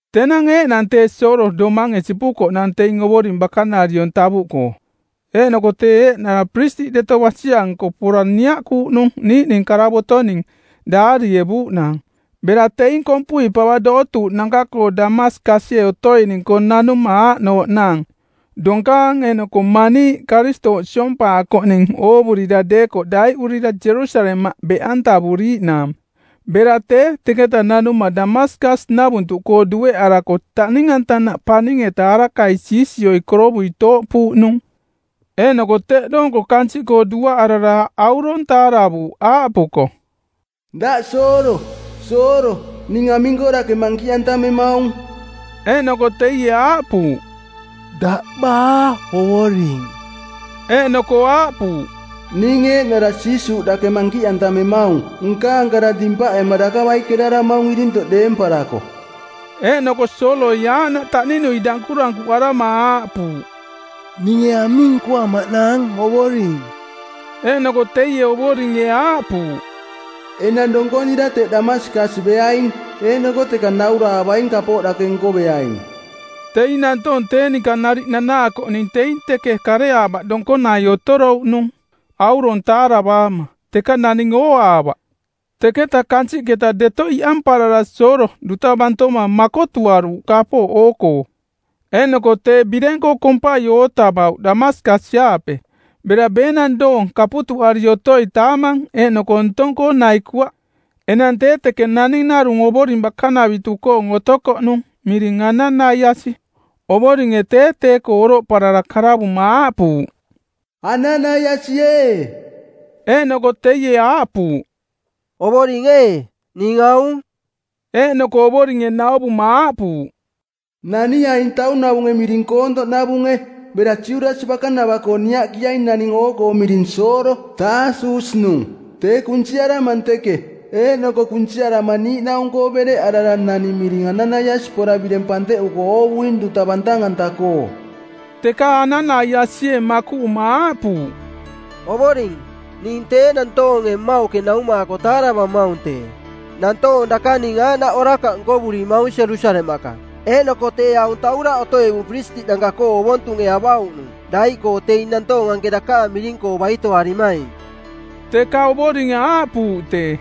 Tenang eeꞌnang tee Soolo domange sipukoꞌnang teing Ovoring bakanariong tavuꞌkoo. Eeꞌnoko tee eeꞌnara piristiꞌ deto basi-anko pora niaꞌkuuꞌ niiꞌning karavotoning˜ daarievuuꞌnaang, bera teing kompui pava dootuuꞌnanka-koo Damaskasie otoining-koo nanuma aaꞌnooꞌnaang: donkaang eeꞌnoko maniiꞌ Karistooꞌ siompaakoꞌning oovurira deekoꞌ daiꞌurira Jerusalemaꞌ beꞌantavuriiꞌnaang. Bera tee teketa nanuma Damaskas-navuntuꞌkoo dueꞌarako taꞌning-antanaꞌ paning-eta arakai siisioi korovui tooꞌpuuꞌnung. Eeꞌnoko teꞌ doonko kansiꞌkoo duaꞌarara aurong taaravuuꞌ aaꞌpuko, “Daꞌ Soolo, Soolo, ning aming-koo dake mankiꞌantamemaung?” Eeꞌnoko teie aaꞌpuuꞌ, “Daꞌ baa Ovoring?” Eeꞌnoko aaꞌpuuꞌ, “Ning eeꞌnara Jiisuuꞌ dake mankiꞌantamemaung. Nkaang kara dimpaꞌema daka baikeraramaung irintoꞌ deemparako.” Eeꞌnoko Sooloi aaꞌnaꞌ taꞌninui dankurankuꞌarama aaꞌpuuꞌ, “Ninge aming nkoamaꞌnaang, Ovoring?” Eeꞌnoko teie Ovoringe aaꞌpuuꞌ, “Enang donkonira teꞌ Damaskas beaing, eeꞌnoko teka nauraavaing kapooꞌ dake nkoveaing.” Teing nantoong tee ninka nariꞌ nanaakoꞌning teing teke kareaavaꞌ donkonai otorouꞌnung, aurong taaravaama, teka naning ooaavaꞌ. Teketa kansiꞌketa deto iꞌamparara Soolo duta bantoma makotuaruuꞌ kapooꞌ oo-koo. Eeꞌnoko tee bireng-koo kompai ootavauꞌ Damaskas-aape. Bera beenang doong kaputuꞌari otoi taamang eeꞌnoko ntong-koo naikuaꞌ. Enang tee teke naning narung Ovoring bakanavitu-koong otokoꞌnung miring Ananaiasi. Ovoringe tee tee-koo oroꞌparara karavuma aaꞌpuuꞌ, “Ananaiasi ee.” Eeꞌnoko teie aaꞌpuuꞌ, “Ovoring ee, ning aung.” Eeꞌnoko Ovoringe nauvuma aaꞌpuuꞌ, “Naniaing taunavunge miring Koontoꞌnavunge, bera Judasi bakanava-koo niaꞌkiaing naning oo-koo miring Soolo, Taasus-nung. Tee kunsiaramang teke. Eeꞌnoko kunsiarama niiꞌnaung˜koo bereꞌarara naning miring Ananaiasi pora bireng panteꞌuko oovuing duta bantang-anta-koo.” Teka Ananaiasie makuꞌuma aaꞌpuuꞌ, “Ovoring, ning tee nantoonge mmauꞌke naumaako taaravamaung tee. Nantoong dakaning aaꞌnaꞌ orakaꞌ nkovurimaung Jerusalemaꞌka. Eeꞌnoko tee aung tauraꞌ otoꞌevung piristiꞌnanka-koo ovontunge avauꞌnung daiꞌkoo teing nantoong anke dakaang miring-koo baitoarimaing.” Teka Ovoringe aaꞌpuuꞌ tee,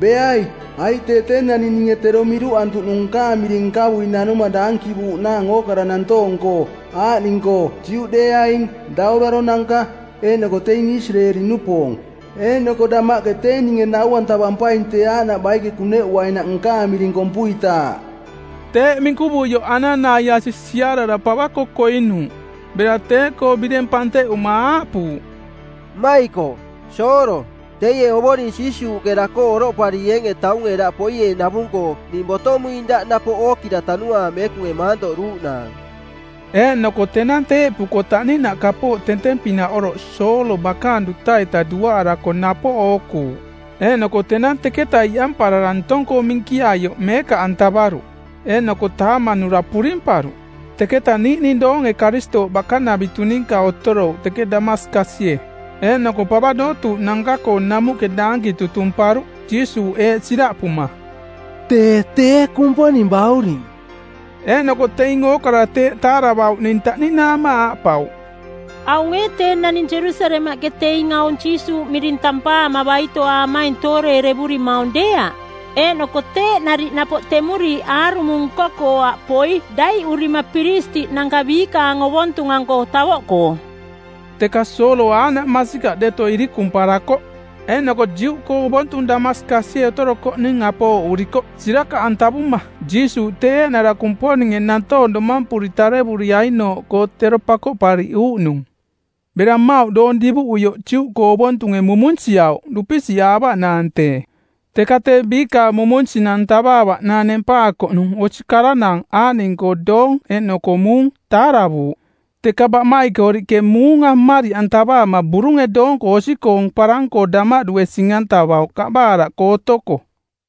“Beai, aiꞌ tee tee naning ninge tero miruꞌantuꞌnung nkaang miring nkavui nanuma daankivuuꞌnaang ookara nantoong-koo, aaꞌning-koo Juꞌdeeaing, dauraronanka, eeꞌnoko teing Isireeli-nupoong. Eeꞌnoko damaꞌke tee ninge nau-antavampaing tee aaꞌnaꞌ baike kuneꞌuainaꞌ nkaang miring kompuitaaꞌ.” Teeꞌ minkuvuioꞌ Ananaiasi siarara pava-koo koinuuꞌ. Bera tee-koo bireng panteꞌuma aaꞌpuuꞌ, “Mmaikoꞌ, Soolo, teie Ovoring Jiisuuꞌke daꞌkoo oroꞌparieenge taunge daꞌ poieenavung-koo ning botomuing daꞌ napoꞌ ookira Tanuaang Meekunge maantoꞌduuꞌnaang.” Eeꞌnoko tenang teeꞌpuko taꞌninaꞌ kapooꞌ tenteng-pinaꞌ oroꞌ Soolo bakaang duta-ita duaꞌarako napoꞌ ookuuꞌ. Eeꞌnoko tenang teketa iꞌamparara ntong-koo minkiaioꞌ meekaꞌantavaruꞌ. Eeꞌnoko taamanura purimparuꞌ. Teketa niiꞌning doonge Karistooꞌ bakanavitu ninka otorouꞌ teke Damaskasie. Eeꞌnoko pava dootuuꞌnanka-koo namuꞌke daankinang tutumparuꞌ Jiisuuꞌ eeꞌ siraꞌpuma, “Tee tee Kumponing Bauring.” Eeꞌnoko teing ookara tee taaravauꞌning taꞌninaama aaꞌpauꞌ, “Aung ee tee naning Jerusalemaꞌke teing aung Jiisuuꞌ miring tampaama baitoaamaing tooreerevurimaung deeaꞌ? Eeꞌnoko teeꞌ nariꞌ napoꞌ temuriiꞌ aarumo nko-koo aꞌ poi daiꞌurima piristiꞌnanka biikaang ovontung-anko tavoꞌkoo.” Teka Soolo aaꞌnaꞌ masikaꞌ deto irikumparakoꞌ eeꞌnoko Juꞌkoong ovontung Damaskasie otorokoꞌning apooꞌurikoꞌ sirakaꞌantavuma Jiisuuꞌ tee eeꞌnara Kumponinge nantoong domampuri tarevuriainooꞌkoo tero Pakoꞌpariꞌuuꞌnung˜. Bera mmauꞌ doong divuꞌuioꞌ Juꞌkoong ovontunge mumunsiauꞌ dupisiꞌaavaꞌnaang tee. Teka tee biikaang mumunsinang tavaavaꞌnaang nempaakoꞌnung osi karanaang aaꞌning-koo doong eeꞌnoko muung, taaravuuꞌ. Teka baꞌmaikoriꞌke muunga mmariꞌantavaama burunge doonko osi-koong parang-koo damaꞌdue sing-antavauꞌ kaꞌbaraaꞌkoo otoko.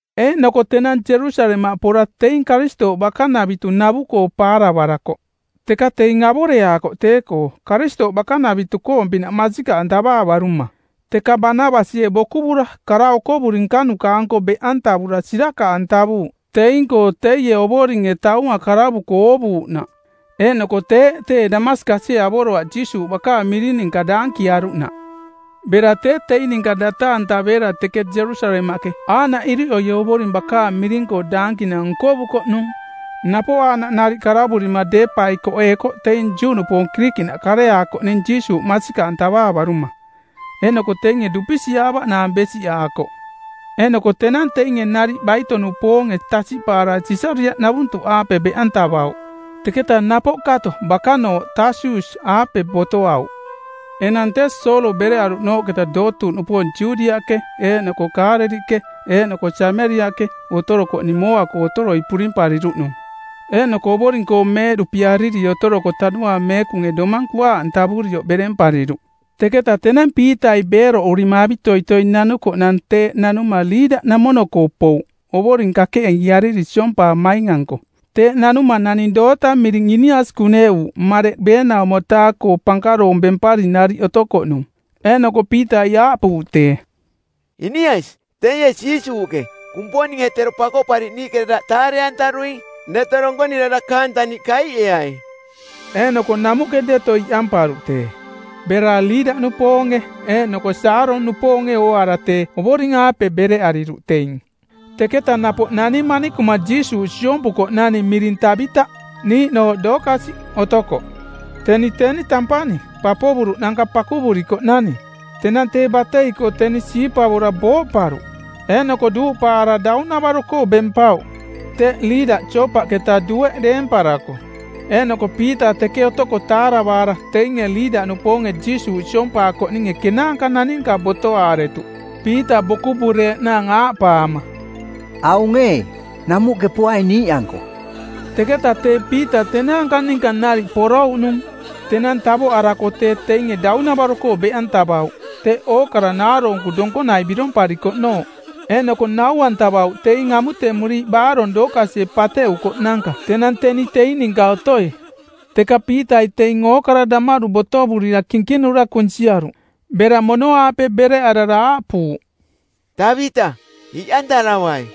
Eeꞌnoko tenang Jerusalemaꞌ pora teing Karistooꞌ bakanavitu navu-koo paaravarakoꞌ, teka teing avoreaakoꞌ tee-koo Karistooꞌ bakanavitu-koong-pinaꞌ masikaꞌantavaavaruma. Teka Banabasie bokuvura kara okovuri nkanuka-anko beꞌantavura sirakaꞌantavuuꞌ teing-koo teie Ovoringe taunga karavuko oovuuꞌnaꞌ eeꞌnoko teeꞌ tee Damaskasie avoroaꞌ Jiisuuꞌ bakaang miring ninka daankiaruꞌnaꞌ. Bera tee teing ninka data-antaveera teke Jerusalemaꞌke aaꞌnaꞌ iriꞌoi Ovoring bakaang miring-koo daankinang nkovukoꞌnung. Napoꞌ aaꞌnaꞌ nariꞌ karavurima deepaikoꞌeekoꞌ teing Juꞌnupoong Kirikiꞌnaꞌ kareaakoꞌning Jiisuuꞌ masikaꞌantavaavaruma, eeꞌnoko teinge dupisiꞌaavaꞌnaang besiꞌaakoꞌ. Eeꞌnoko tenang teinge nariꞌ baito-nupoonge tasiꞌpaara Sisariaꞌnavuntuꞌaape beꞌantavauꞌ. Teketa napoꞌ kato bakanooꞌ Taasus-aape botoauꞌ. Enang tee Soolo bereꞌaruꞌnooꞌketa dootuuꞌnupoong Judiaꞌke eeꞌnoko Kaaleliꞌke eeꞌnoko Sameriaꞌke otorokoꞌning mooa-koo otoroi purimpariruꞌnung, eeꞌnoko Ovoring-koo meeꞌduꞌpiariri otoroko Tanuaang Meekunge domang kuaaꞌantavurioꞌ berempariruꞌ. Teketa tenang Piitai beeroꞌurima avitoitoi nanukoꞌnang, teeꞌ nanuma Liida-namono-koo pouꞌ Ovoring kakeꞌiiariri siompaamaing-anko. Teeꞌ nanuma naning doota miring Inias kuneꞌuuꞌ mareꞌ ˜beenaumo-taa-koo pankaroong bempari nariꞌ otokoꞌnung. Eeꞌnoko Piitai aaꞌpuuꞌ tee, “Inias, teie Jiisuuꞌke, Kumponinge tero Pakoꞌpariꞌniiꞌke daꞌ taare-antaruing. Deto donkonira dakaang taniꞌ kaiꞌeai.” Eeꞌnoko namuꞌke deto iꞌamparuꞌ tee. Bera Liida-nupoonge eeꞌnoko Saaron-nupoonge ooaara tee Ovoring-aape bereꞌariruꞌ teing. Teketa napoꞌ nani manikuma Jiisuuꞌ siompukoꞌnani miring Tabita, niiꞌnooꞌ Dookasi otokoꞌ. Teni teni tampani, papovuruꞌnanka pakuvurikoꞌnani. Tenang tee batei-koo teni siipavora booꞌparuꞌ. Eeꞌnoko duuꞌpaara daunavaro-koo bempauꞌ. Teꞌ Liida Joopaꞌketa dueꞌ deemparako, eeꞌnoko Piita teke otoko taaravaara teinge Liida-nupoonge Jiisuuꞌ siompaakoꞌninge kenaanka naninka botoaaretuꞌ Piita bokuvureeꞌnaang aaꞌpaama, “Aung ee, namuꞌke poai niiꞌanko.” Teketa tee Piita tenaanka ninka nariꞌ porouꞌnung. Tenang tavoꞌarako tee teinge daunavaro-koo beꞌantavauꞌ teꞌ ookara naaroonku donkonai biromparikoꞌnooꞌ. Eeꞌnoko nau-antavauꞌ teing amutemuriiꞌ baarong Dookasie pateꞌukoꞌnanka tenang teni teing ninka otoi. Teka Piitai teing ookara damaꞌdu botovurira kinkinura kunsiaruꞌ. Bera mono-aape bereꞌarara aaꞌpuuꞌ, “Tabita, iꞌantaravai.”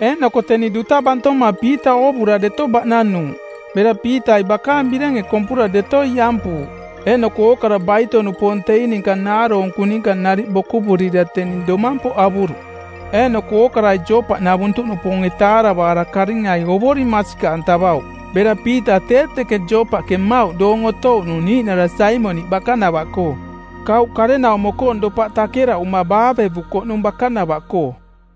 Eeꞌnoko teni duta bantoma Piita oovura deto baꞌnanuuꞌ. Bera Piitai bakaang birenge kompura deto iꞌampuuꞌ. Eeꞌnoko ookara baito-nupoong teing ninka naaroonkunanka ninka nariꞌ bokuvurira teni domampoꞌ avuruꞌ. Eeꞌnoko ookarai Joopaꞌnavuntuꞌnupoonge taaravaara karingai Ovoring masikaꞌantavauꞌ. Bera Piita tee teke Joopaꞌke mmauꞌ doong otouꞌnung niiꞌnara Saimoniꞌ bakanavaꞌkoo, kauꞌ karenaumo-koong dopaꞌ takeraꞌuma baavevukoꞌnung bakanava-koo.